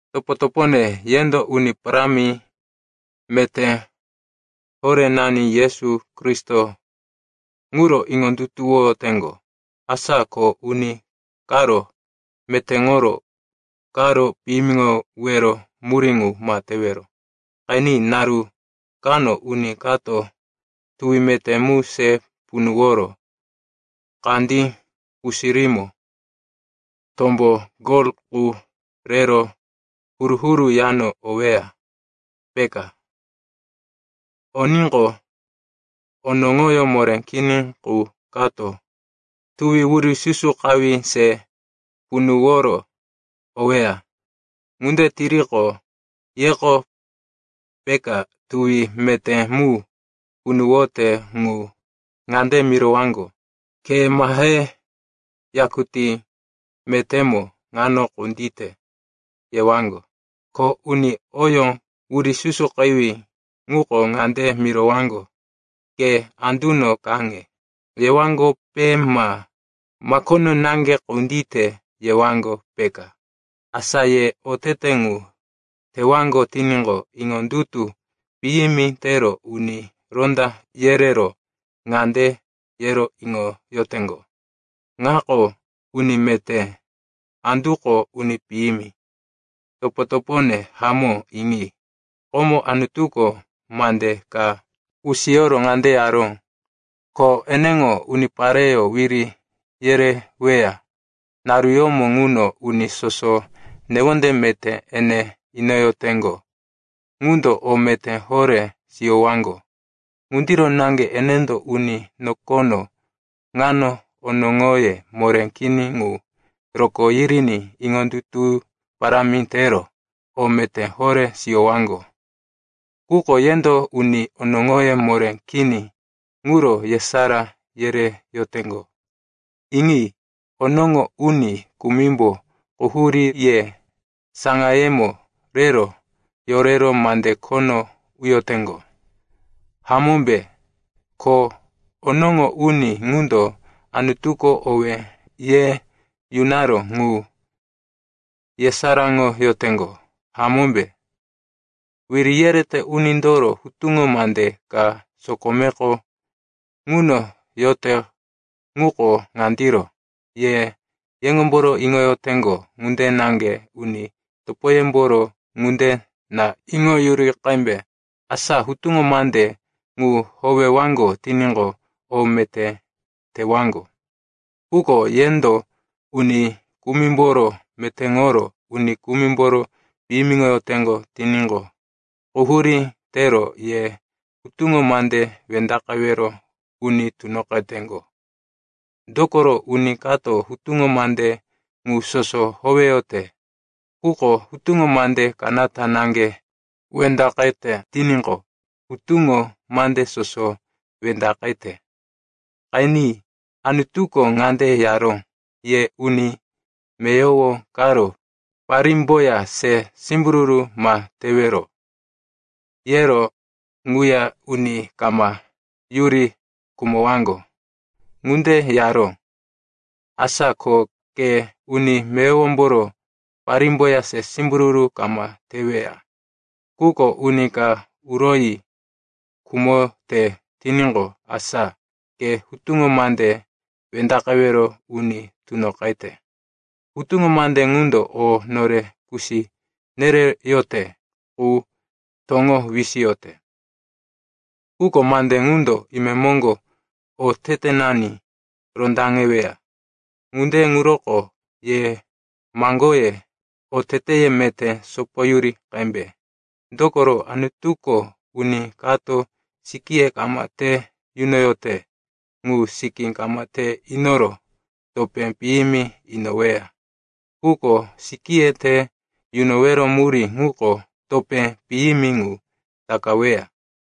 Topo-topone, yendo Uni Parámi meté horénani Yesu Kristo ŋuro iŋondutuwoyoteŋgo. Asa ko uni karo metéŋoro karo piyimiŋowero murí ŋu ma tewero. Qeni, naru kano uni kato tuwi meté mu se punuworo kandí pusirímo tombo gol qu rero huru-huru yano oweya, peka. Oníqo, onoŋoyó moré kini qu kato tuwi wurisusukawí se punuworo oweya. Ŋunde tiriqo, yeko peka tuwi meté mu punuwote ŋu ŋande mirowaŋgo, “Ke mahe, yakutí metémo ŋano kundite,” yewaŋgo. Ko uni oyó wurisusukawí ŋuko ŋande mirowaŋgo, “Ke anduno kaŋe,” yewaŋgope ma, “Makono naŋge kundite,” yewaŋgo, peka. Asa ye otete ŋu tewaŋgo tiníqo, iŋondutu piyimi tero uni ronda yerero ŋande yero iŋoyoteŋgo, “Ŋako uni meté, anduko uni piyimi.” Topo-topone hamó, iŋi. Komo Anutuko mande ka kusiyoro ŋande yaró, ko eneŋo unipareyó wiri yereweya naruyómo ŋuno uni soso newonde meté ene inoyoteŋgo ŋundo o meté horé siyowaŋgo. Ŋundiro naŋge enendo uni nokono ŋano onoŋoye moré kini ŋu rokó yiriní iŋondutu parámi tero o meté horé siyowaŋgo. Quko yendo uni onoŋoye moré kini ŋuro yesará yereyoteŋgo. Iŋi, onoŋo uni kumimbo quhurí ye saŋayemo rero yorero mande khono uyoteŋgo, hamómbe? Ko onoŋo uni ŋundo Anutuko owé ye yunaró ŋu yesaráŋoyoteŋgo, hamómbe? Wiri yerete unindoro hutuŋo mande ka sokomeko ŋuno yote ŋuko ŋandiro, “Ye yeŋomboro iŋoyoteŋgo ŋunde naŋge uni topoyemboro ŋunde na iŋoyuri qembe.” Asa hutuŋo mande ŋu howewaŋgo tiníqo, o meté tewaŋgo. Quko yendo uni kumimboro metéŋoro uni kumimboro piyimiŋoyoteŋgo tiníqo, quhurí tero ye hutuŋo mande wendaqewero uni tunoqeteŋgo. Dokoro uni kato hutuŋo mande ŋu soso howeyote, quko hutuŋo mande kanata naŋge wendaqete tiníqo, hutuŋo mande soso wendaqete. Qeni, Anutuko ŋande yaró, “Ye uni meyowo karo parímboya se simbururu ma tewero.” Yero ŋuya, “Uni kama yuri khumowaŋgo,” ŋunde yaró. Asa ko ke uni meyowomboro parímboya se simbururu kama teweya, quko uni ka uroyi khumote tiníqo, asa ke hutuŋo mande wendaqewero uni tunoqete. Hutuŋo mande ŋundo o nore kusi nereyote qu toŋo wisiyote. Quko mande ŋundo imemoŋgo otetenani rondaŋeweya. Ŋunde ŋuroko ye maŋgoye, oteteye meté sopoyuri qembe. Dokoro Anutuko uni kato sikíye kama te yunoyote ŋu sikí kama te inoro topé piyimi inoweya. Quko sikíye te yunowero murí ŋuko topé piyimi ŋu takaweya.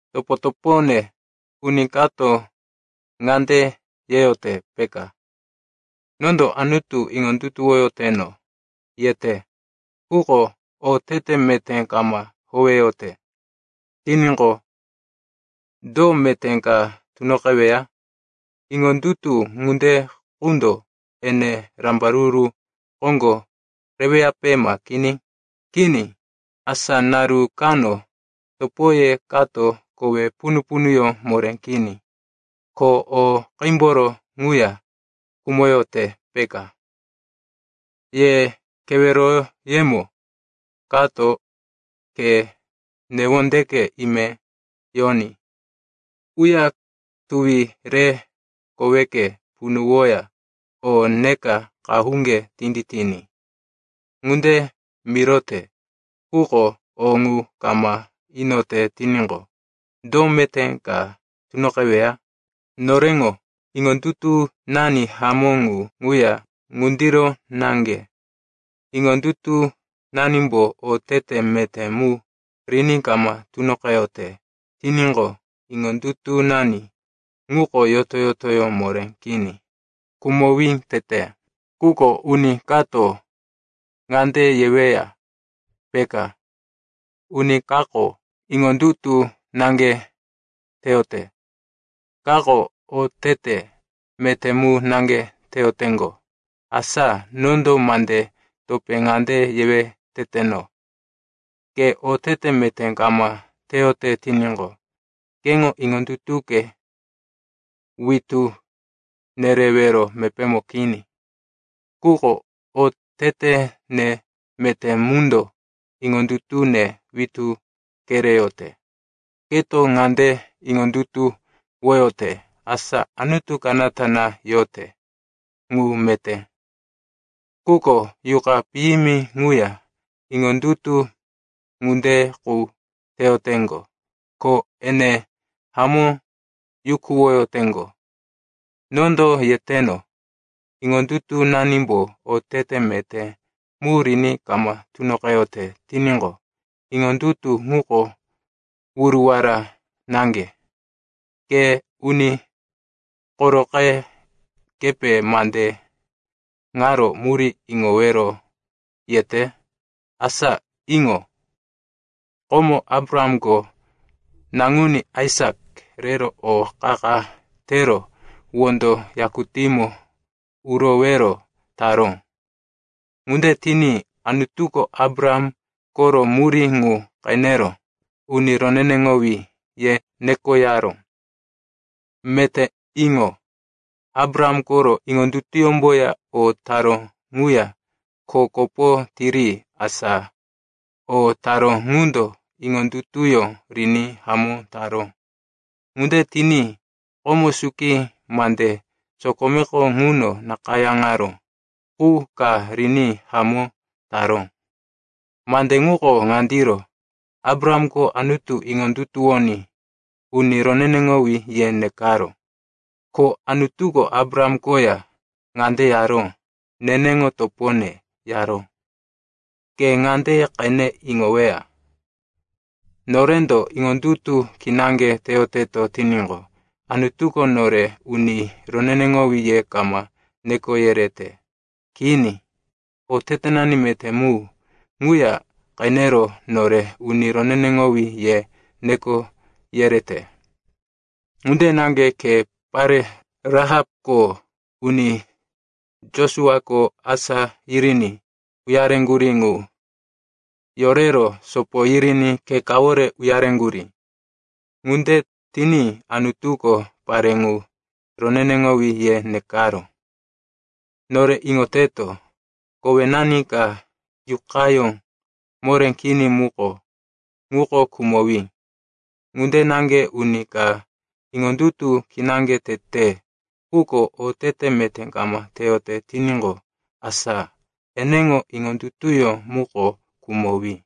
Topo-topone, uni kato ŋande yeyote, peka, “Nondo Anutu iŋondutuwoyoteno,” yete, quko otete meté kama howeyote tiníqo, do meté ka tunoqeweya? Iŋondutu ŋunde qundo ene rambaruru koŋgo reweyape ma kini? Kini. Asa naru kano topoye kato kowe punu-punuyó moré kini, ko o qímboro ŋuya khumoyote, peka. Ye keweroyemo kato, “Ke newondeke ime yoní. Uya tuwi re koweke punuwoya o neka qahuŋge tinditiní,” ŋunde mirote, quko o ŋu kama inote tiníqo, do meté ka tunoqeweya? Noreŋo iŋondutunani hamó ŋu ŋuya ŋundiro naŋge. Iŋondutunanimbo otete meté mu riní kama tunoqeyote tiníqo, iŋondutunani ŋuko yoto-yotoyó moré kini, khumowí tete. Quko uni kato ŋande yeweya, peka, “Uni kako iŋondutu naŋge teyote, kako otete meté mu naŋge teyoteŋgo.” Asa nondo mande topé ŋande yewe teteno, “Ke otete meté kama teyote tiníqo, keŋo iŋondutuke witú nerewero mepémo kini. Quko otetene meté mundo iŋondutune witú kereyote.” Keto ŋande iŋondutuwoyote, asa Anutu kanata na yote. Ŋu meté. Quko yuqa piyimi ŋuya iŋondutu ŋunde qu teyoteŋgo, ko ene hamó yukuwoyoteŋgo. Nondo yeteno, iŋondutunanimbo otete meté mu riní kama tunoqeyote tiníqo, iŋondutu ŋuko wuruwara naŋge. Ke uni koroqe, kepe mande ŋaro murí iŋowero yete? Asa iŋo. Komo Abrahamko naŋuní Aisak rero o qa-qa tero wondo yakutímo urowero taró. Ŋunde tiní Anutuko Abraham koro murí ŋu qenero, uni roneneŋowí, ye nekoyaró. Meté iŋo. Abraham koro iŋondutuyómboya o taró ŋuya kho kopo tiri, asa o taró ŋundo iŋondutuyó riní hamó taró. Ŋunde tiní komo suki mande sokomeko ŋuno nakayáŋaró qu ka riní hamó taró. Mande ŋuko ŋandiro, “Abrahamko Anutu iŋondutuwoní, uni roneneŋowí, ye nekaró.” Ko Anutuko Abraham koya ŋande yaró, “Neneŋo topone,” yaró. Ke ŋande qene iŋoweya, norendo iŋondutu kinaŋge teyoteto tiníqo, Anutuko nore uni roneneŋowí ye kama neko yerete. Kini. Otetenani meté mu ŋuya qenero nore, uni roneneŋowí, ye neko yerete. Ŋunde naŋge khe pare Rahapko uni Josuako asá yiriní uyareŋgurí ŋu yorero sopo yiriní khe kawore uyareŋgurí. Ŋunde tiní Anutuko pare ŋu, roneneŋowí, ye nekaró. Nore iŋoteto, kowenani ka yuqayó moré kini muko, ŋuko khumowí. Ŋunde naŋge uni ka iŋondutu kinaŋge tete, quko otete meté kama teyote tiníqo, asa eneŋo iŋondutuyó muko khumowí.